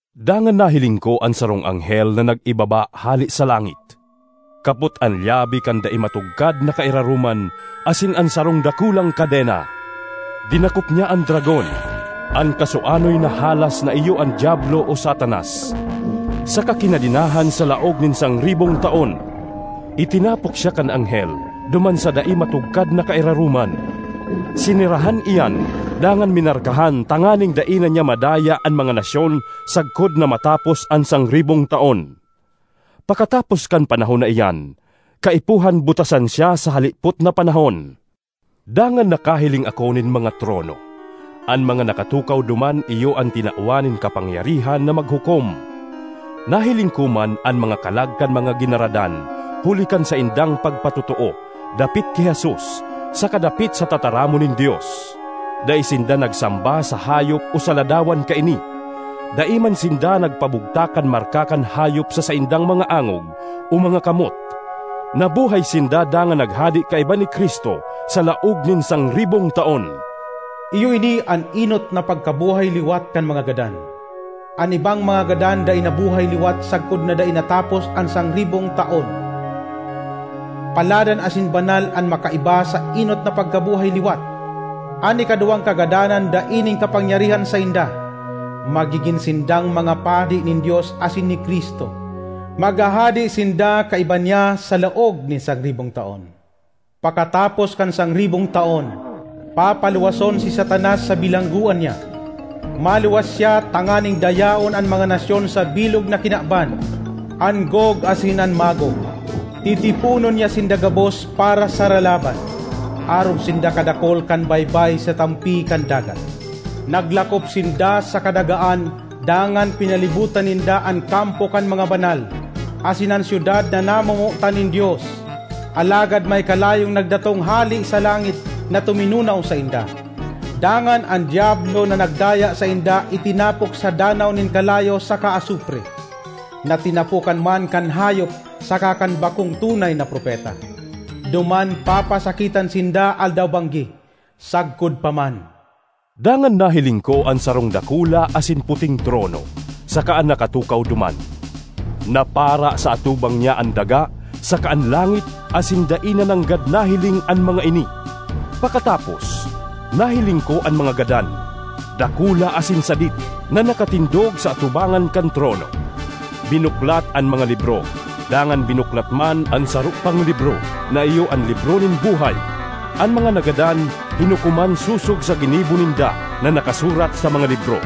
Dangan nahiling ko an sarong anghel na nag-iibaba hale sa langit, kapot an lyabe kan dai matugkad na kairaroman asin an sarong dakulang kadena. Dinakop niya an dragon, an kasuanoy na halas na iyo an Diablo o Satanas, saka kinadenahan sa laog nin sangribong taon. Itinapok siya kan anghel duman sa dai matugkad na kairaroman, sinerahan iyan dangan minarkahan tanganing dai na niya madaya an mga nasyon sagkod na matapos an sangribong taon. Pakatapos kan panahon na iyan, kaipuhan butasan siya sa halipot na panahon. Dangan nakahiling ako nin mga trono. An mga nakatukaw duman iyo an tinawan nin kapangyarihan na maghukom. Nahiling ko man an mga kalag kan mga ginaradan huli kan saindang pagpatotoo dapit ki Jesus saka dapit sa tataramon nin Dios. Dai sinda nagsamba sa hayop o sa ladawan kaini; dai man sinda nagpabugtak kan marka kan hayop sa saindang mga angog o mga kamot. Nabuhay sinda dangan naghade kaiba ni Cristo sa laog nin sangribong taon. Iyo ini an enot na pagkabuhay liwat kan mga gadan. An ibang mga gadan dai nabuhay liwat sagkod na dai natapos an sangribong taon. Paladan asin banal an makaiba sa enot na pagkabuhay liwat! An ikaduwang kagadanan dai nin kapangyarihan sainda; magigin sindang mga padi nin Dios asin ni Cristo; maghahade sinda kaiba niya sa laog nin sangribong taon. Pakatapos kan sangribong taon, papaluwason si Satanas sa bilanggoan niya. Maluwas siya tanganing dayaon an mga nasyon sa bilog na kinaban—an Gog asin an Magog. Titiponon niya sinda gabos para sa ralaban. Arog sinda kadakul kan baybay sa tampi kan dagat. Naglakop sinda sa kadagaan dangan pinalibotan ninda an kampo kan mga banal, asin an syudad na namomotan nin Dios. Alagad may kalayong nagdatong hale sa langit na tuminunaw sainda. Dangan an Diablo na nagdaya sainda itinapok sa danaw nin kalayo saka asupre, na tinapokan man kan hayop saka kan bakong tunay na propeta. Duman papasakitan sinda aldaw-banggi, sagkod pa man. Dangan nahiling ko an sarong dakula asin puting trono saka an nakatukaw duman. Napara sa atubang niya an daga saka an langit asin dai na nanggad nahiling an mga ini. Pakatapos, nahiling ko an mga gadan, dakula asin sadit, na nakatindog sa atubangan kan trono. Binuklat an mga libro, dangan binuklat man an saro pang libro na iyo an libro nin buhay. An mga nagadan hinukoman sosog sa ginibo ninda na nakasurat sa mga libro.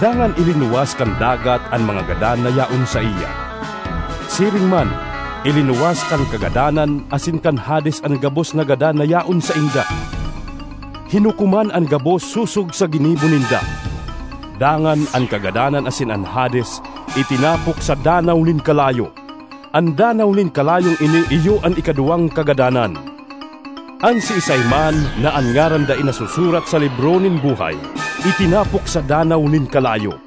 Dangan ilinuwas kan dagat an mga gadan na yaon saiya; siring man ilinuwas kan Kagadanan asin kan Hades an gabos na gadan na yaon sainda. Hinukoman an gabos sosog sa ginibo ninda. Dangan an Kagadanan asin an Hades itinapok sa danaw nin kalayo. (An danaw nin kalayong ini iyo an ikaduwang kagadanan.) An siisay man na an ngaran dai nasusurat sa libro nin buhay itinapok sa danaw nin kalayo.